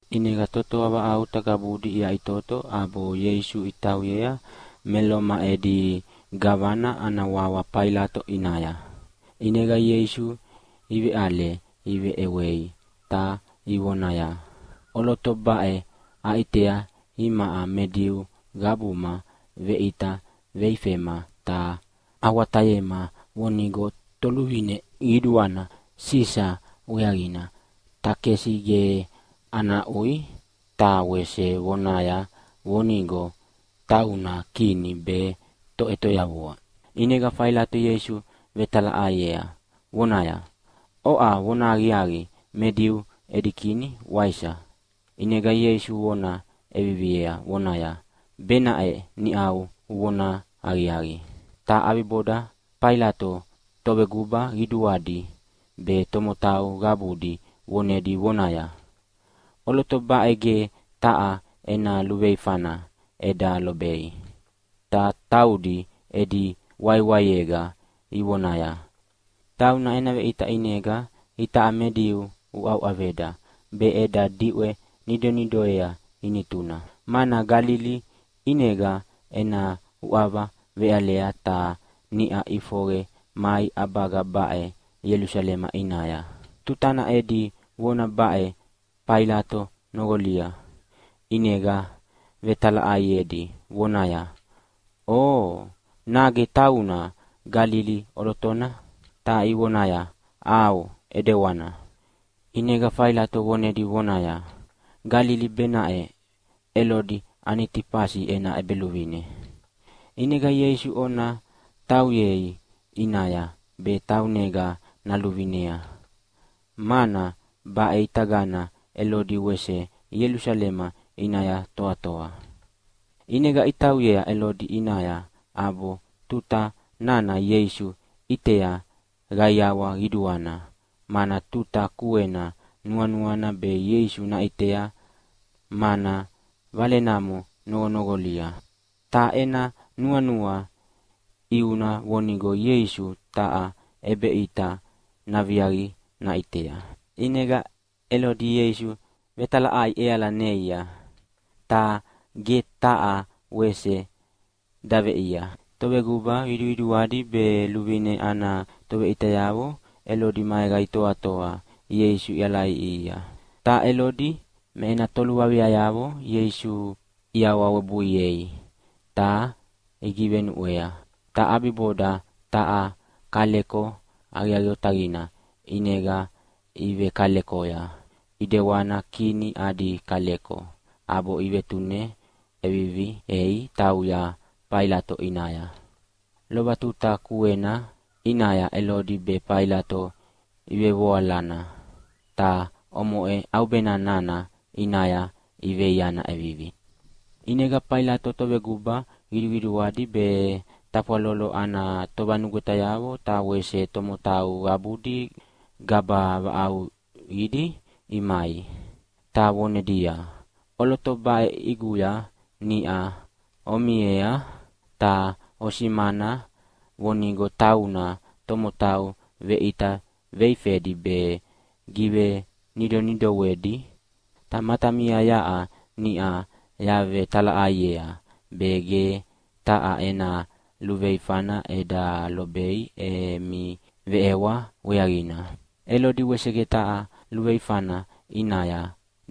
ʼInega totoa vaʼauta qabudi iyaʼitoto ʼabo Ieisu itauyea me Loma edi gavana ana wawa Failato ʼiawanaya. ʼInega Ieisu iveʼale iveʼewei ta ivonaya, “ʼOloto baʼe aʼitea imaʼa me Diu qabuma veʼita veifema ta awatayema vonigo toluvine qiduana Sisa weaqina takesi ge ana aʼui, ta wese vonaya vonigo tauna Kini be Toʼetoyavua.” ʼInega Failato Ieisu vetalaʼaiea vonaya, “Oʼa vonahaqiaqi me Diu edi Kini, waisa?” ʼInega Ieisu vona ʼeviviea vonaya, “Benaʼe niʼau uvona aqiaqi.” Ta ʼabiboda Failato toveguba qiduqiduadi be tomotau qabudi vonedi vonaya, “ʼOloto baʼe ge taha ena luveifana eda lobei.” Ta taudi edi waiwaiega ivonaya, “Tauna ena veʼita ʼinega itaʼa me Diu uʼauʼaveda be eda diʼwe nidonidoea ʼinituna. Mana Galili ʼinega ena uʼava veʼalea ta niʼa ʼifoqe mai ʼabaga baʼe Ielusalema ʼinaya.” Tutana edi vona baʼe Failato noqolia ʼinega vetalaʼaiedi vonaya, “Oo, nage tauna Galili ʼolotona?” Ta ivonaya, “ʼAo, ʼedewana.” ʼInega Failato vonedi vonaya, “Galili benaʼena Elodi Anitifasi ena ʼebeluvine. ʼInega Ieisu ona tauyei ʼinaya be taunega naluvinea, mana baʼitagana Elodi wese Ielusalema ʼinaya toatoa.” ʼInega itauyea Elodi ʼinaya ʼabo tuta nana Ieisu ʼitea qaiawa qiduana, mana tuta kuena nuanuana be Ieisu naʼitea, mana valenamo noqonoqolia. Ta ena nuanua ʼiuna vonigo Ieisu taha ʼebeʼita naviaqi naʼitea. ʼInega Elodi Ieisu vetalaʼai ʼeala neia, ta ge taha wese daveʼiea. Toveguba qiduqiduadi be luvine ana toveʼitayavo Elodi maega itoatoa Ieisu ialaʼiʼihia. Ta Elodi me ena toluaviayavo Ieisu iawawebuiei ta igivenuʼwea. Ta ʼabiboda taha kaleko aqiaqi otaqina ʼinega ivekalekoya, ʼidewana kini adi kaleko, ʼabo ivetune ʼeviviei tauya Failato ʼinaya. Lova tuta kuena ʼinaya Elodi be Failato ivevoalana, ta omoʼe ʼaubena nana ʼinaya iveiana ʼevivi. ʼInega Failato toveguba qiduqiduadi be tafwalolo ana tovanugwetayavo ta wese tomotau qabudi gaba vaʼauqidi imai, ta vonedia, “ʼOloto baʼe ʼiguya niʼa omiea ta osimana vonigo tauna tomotau veʼita veifedi be givenidonidoedi. Ta matamia yaʼa niʼa yavetalaʼaiea be ge taha ena luveifana eda lobei emi veʼewa weaqina. Elodi wese ge taha luveifana ʼinaya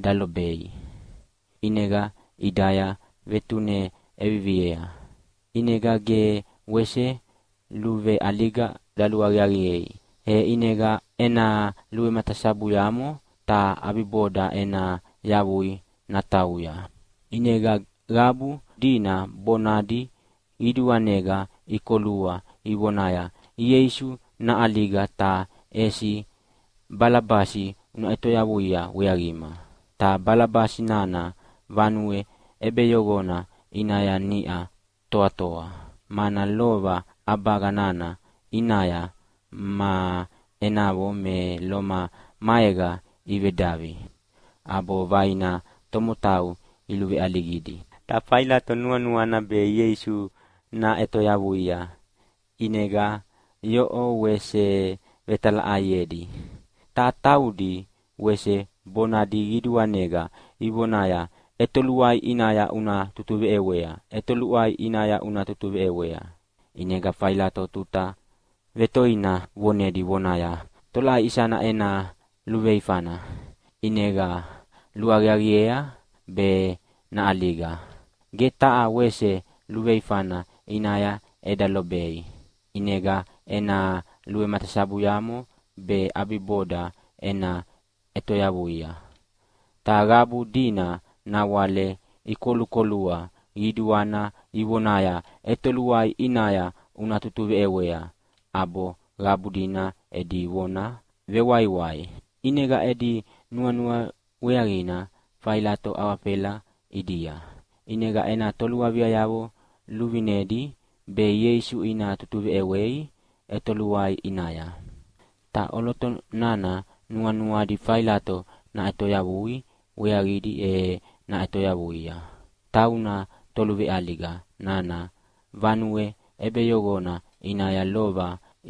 dalobei, ʼinega ʼidaya vetune ʼeviviea. ʼInega ge wese luveʼaliga daluaqiaqiei. E ʼinega ena luvematasabuyamo ta ʼabiboda ena yavui natauya.” ʼInega qabu dina bonadi qiduanega ikolua ivonaya, “Ieisu naʼaliga, ta ʼesi Balabasi una ʼetoyavuia weaqima!” Ta Balabasi nana vanue ʼebeyoqona ʼinaya niʼa toatoa, mana lova ʼabaga nana ʼinaya ma enavo me Loma maega ivedavi ʼabo vaina tomotau iluveʼaligidi. Ta Failato nuanuana be Ieisu naʼetoyavuia ʼinega yoʼo wese vetalaʼaiedi. Ta taudi wese bonadi qiduanega ivonaya, “ʼEtoluai ʼinaya una tutuveʼewea, ʼetoluai ʼinaya una tutuveʼewea!” ʼInega Failato tuta vetoina vonedi vonaya, “Tolaʼai isana ena luveifana ʼinega luaqiaqiea be naʼaliga? Ge taha wese luveifana ʼinaya eda lobei. ʼInegana ena luvematasabuyamo be ʼabiboda ena ʼetoyavuia.” Ta qabu dina nawale ikolukolua qiduana ivonaya, “ʼEtoluai ʼinaya una tutuveʼewea!” ʼAbo qabu dina edi vona vewaiwai, ʼinega edi nuanua weaqina Failato awafela ʼidia, ʼinega ena toluaviayavo luvinedi be Ieisu ina tutuveʼewei ʼetoluai ʼinaya. Ta ʼoloto nana nuanuadi Failato naʼetoyavui weaqidi e ʼetoyavuia, tauna toluveʼaliga nana vanue ʼebeyoqona ʼinaya lova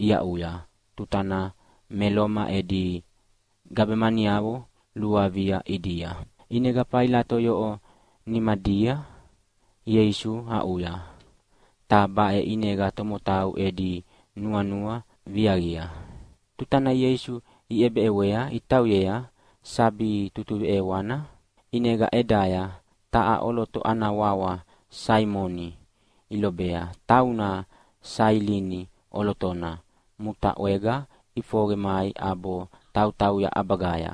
iaʼuya tutana me Loma edi gabemaniavo luavia ʼidia. ʼInega Failato yoʼo nimadia Ieisu aʼuya, ta baʼe ʼinega tomotau edi nuanua viaqia. Tutana Ieisu iʼebeʼewea itauyea sabi tutuveʼewana, ʼinega ʼedaya taha ʼoloto ana wawa Saimoni ilobea, tauna Sailini ʼolotona mutaʼwega ʼifoqe mai ʼabo tautauya ʼabagaya.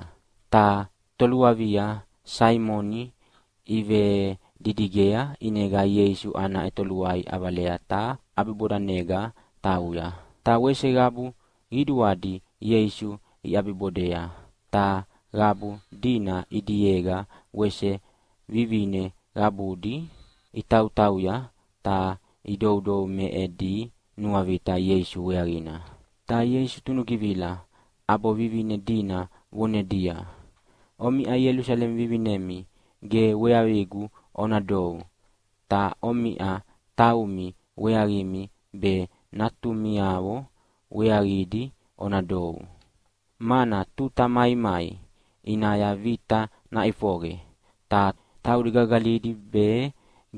Ta toluavia Saimoni ivedidigea ʼinega Ieisu ana ʼetoluai ʼavalea ta ʼabibodanega tauya. Ta wese qabu qiduadi Ieisu iʼabibodea, ta qabu dina ʼidiega wese vivine qabudi itautauya ta idoudou me edi nuavita Ieisu weaqina. Ta Ieisu tunugivila ʼabo vivine dina vonedia, “Omiʼa Ielusalema vivinemi ge weaqigu ona dou, ta omiʼa taumi weaqimi be natumiavo weaqidi ona dou. Mana tuta maimai ʼinaya vita naʼifoqe, ta taudi gagalidi be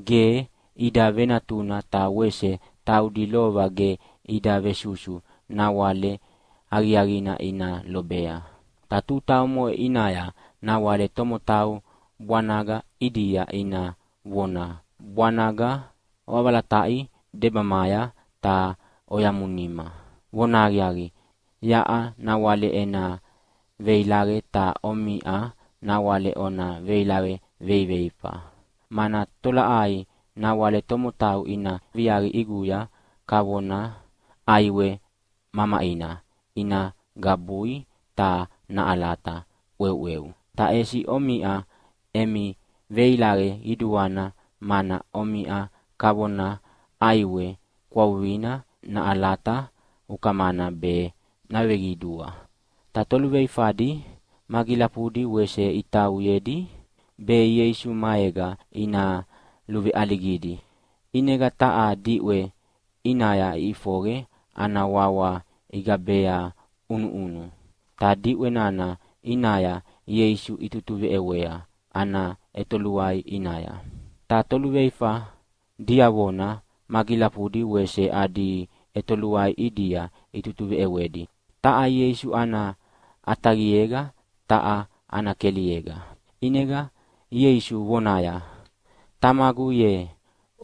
ge ida venatuna ta wese taudi lova ge ida vesusu nawale aqiaqina ina lobea. Ta tuta omoʼe ʼinaya nawale tomotau bwanaga ʼidia ina vona, ‘Bwanaga, oʼavalataʼi debamaya ta oyamunima!’ Vonahaqiaqi, yaʼa nawale ena veilaqe, ta omiʼa nawale ona veilaqe veiveifa. Mana tolaʼai nawale tomotau ina viaqi ʼiguya kavona ʼaiwe mamaʼina ina gabui ta naʼalata ʼweuʼweu. Ta ʼesi omiʼa emi veilaqe qiduana, mana omiʼa kavona ʼaiwe kwavuqina naʼalata ukamana be naveqidua.” Ta toluveifadi magilafudi wese itauyedi, be Ieisu maega ina luveʼaligidi. ʼInega taha diʼwe ʼinaya iʼifoqe ana wawa igabea ʼUnuʼunu, ta diʼwe nana ʼinaya Ieisu itutuveʼewea ana ʼetoluai ʼinaya. Ta toluveifa diavona magilafudi wese adi ʼetoluai ʼidia itutuveʼewedi, taha Ieisu ana ʼataqiega ta taha ana keliega. ʼInega Ieisu vonaya, “Tamagu ye,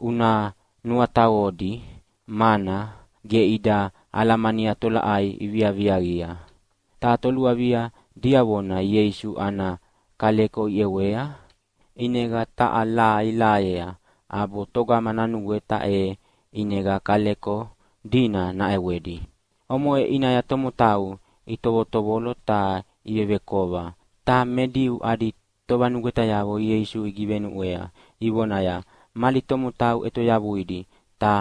una nuataqodi, mana ge ida alamania tolaʼai iviaviaqia.” Ta toluavia diavona Ieisu ana kaleko iʼewea, ʼinega taha laha ilahayea ʼabo togama nanugweta e ʼinega kaleko dina naʼewedi. Omoʼe ʼinaya tomotau itovotovolo ta ivevekova, ta me Diu adi tovanugwetayavo Ieisu igivenuʼwea ivonaya, “Mali tomotau ʼetoyavuidi, ta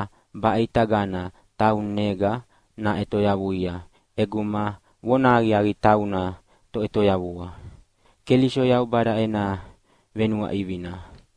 baʼitagana taunega naʼetoyavuia ʼeguma vonahaqiaqi tauna Toʼetoyavua Keliso Yaubada ena venuaʼivina.”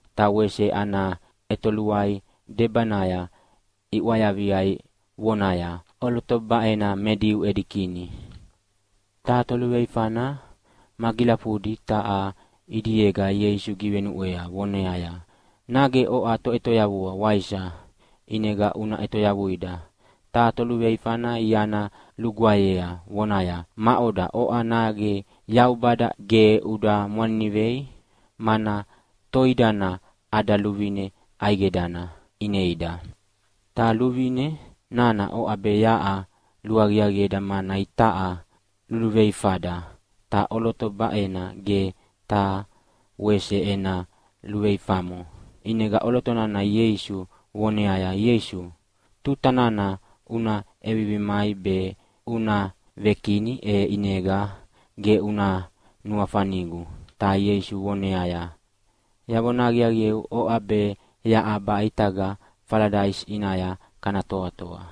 Ta wese ana ʼetoluai debanaya iʼwayavia vonaya, “ʼOloto baʼena me Diu edi Kini”. Ta toluveifana magilafudi taha ʼidiega Ieisu givenuʼwea voneaya, “Nage oʼa Toʼetoyavua, waisa? ʼInega una ʼetoyavuida!” Ta toluveifana iana lugwaeyea vonaya, “Maʼoda oʼa, nage Yaubada ge uda mwaninivei? Mana toidana ada luvine ʼaidegana ineida, ta luvine nana oʼa be yaʼa luaqiaqieda mana itaʼa luveluveifada, ta ʼoloto baʼena ge taha wese ena luveifamo.” ʼInega ʼoloto nana Ieisu voneaya, “Ieisu, tuta nana una ʼevivi mai be una ve-Kini, e ʼinega ge una nuafanigu.” Ta Ieisu voneaya, “Yavona aqiaqieu, oʼa be yaʼa baʼitaga Faladaisi ʼinaya kana toatoa.”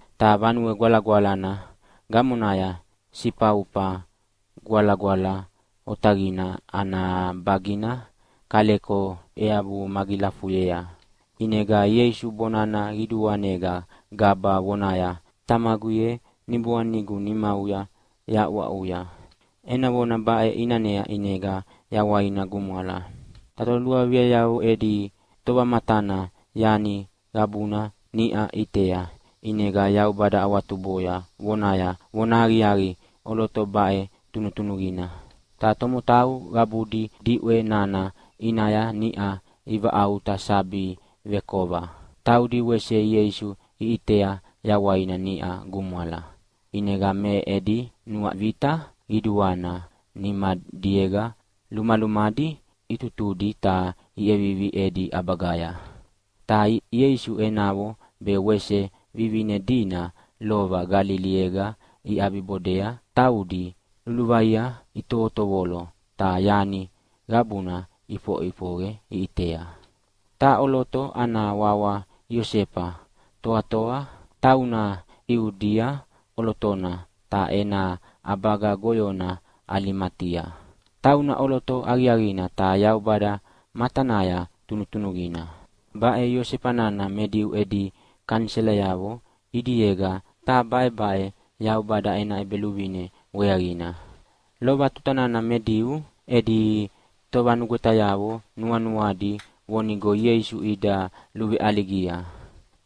Ta Vanue Gwalagwalana gamonaya Sifaufa Gwalagwala Otaqina ana bagina kaleko eabu magilafuyea. ʼInega Ieisu bonana qiduanega gaba vonaya, “Tamagu ye, niboanigu nimauya yahaʼuaʼuya.” Ena vona baʼe ʼinanea ʼinega yawaina gumwala. Ta toluaviayavo edi tovamatana yani qabuna niʼa ʼitea, ʼinega Yaubada awatuboya vonaya, “Vonahaqiaqi, ʼoloto baʼe tunutunuqina.” Ta tomotau qabudi diʼwe nana ʼinaya niʼa ivaʼauta sabi vekova, taudi wese Ieisu iʼitea yawaina niʼa gumwala, ʼinega me edi nuavita qiduana nimadiega lumalumadi itutudi ta iʼevivi edi ʼabagaya. Ta Ieisu enavo be wese vivine dina lova Galiliega iʼabibodea, taudi luluvaia itovotovolo ta yani qabuna ʼifoʼifoqe iʼitea. Taha ʼoloto ana wawa Iosefa toatoa, tauna Iudia ʼolotona ta ena ʼabaga goyona Alimatia. Tauna ʼoloto aqiaqina ta Yaubada matanaya tunutunuqina. Baʼe Iosefa nana me Diu edi kaniselayavo ʼidiega, ta baʼebaʼe Yaubada ena ʼEbeluvine weaqina. Lova tutana me Diu edi tovanugwetayavo nuanuadi vonigo Ieisu ida luveʼaligia,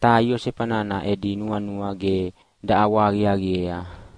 ta Iosefa nana edi nuanua ge daʼawahaqiaqiea.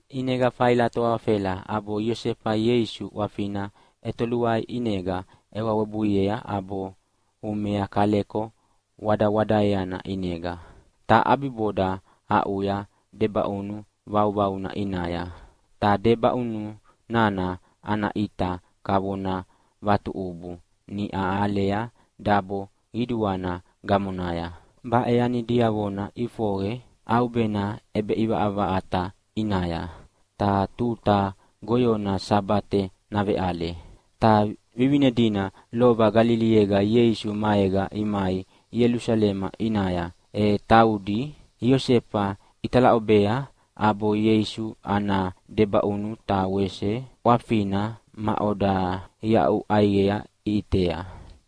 ʼInega Failato awafela ʼabo Iosefa Ieisu ʼwafina ʼetoluai ʼinega ʼewa webuiea ʼabo umea kaleko wadawadaeana ʼinega, ta ʼabiboda aʼuya debaʼunu vauvauna ʼinaya. Ta debaʼunu nana ana ʼita kavona vatuʼubu niʼa ialea dabo qiduana gamonaya. Baʼe yani diavona ʼifoqe ʼaubena ʼebeʼivaʼavaʼata ʼinaya, ta tuta goyona Sabate naveʼale. Ta vivine dina lova Galiliega Ieisu maega imai Ielusalema ʼinaya, e taudi Iosefa italaʼobea ʼabo Ieisu ana debaʼunu ta wese ʼwafina maʼoda iaʼu ʼaiqea iʼitea.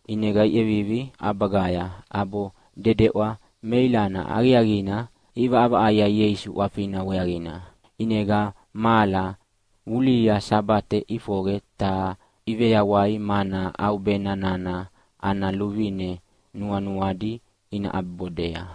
ʼInega iʼevivi ʼabagaya, ʼabo dedeʼwa meilana aqiaqina iʼivaʼavaʼaia Ieisu ʼwafina weaqina. ʼInega mahala vulihia Sabate ʼifoqe ta iveyawai mana ʼaubena nana ana luvine nuanuadi ina ʼabibodea.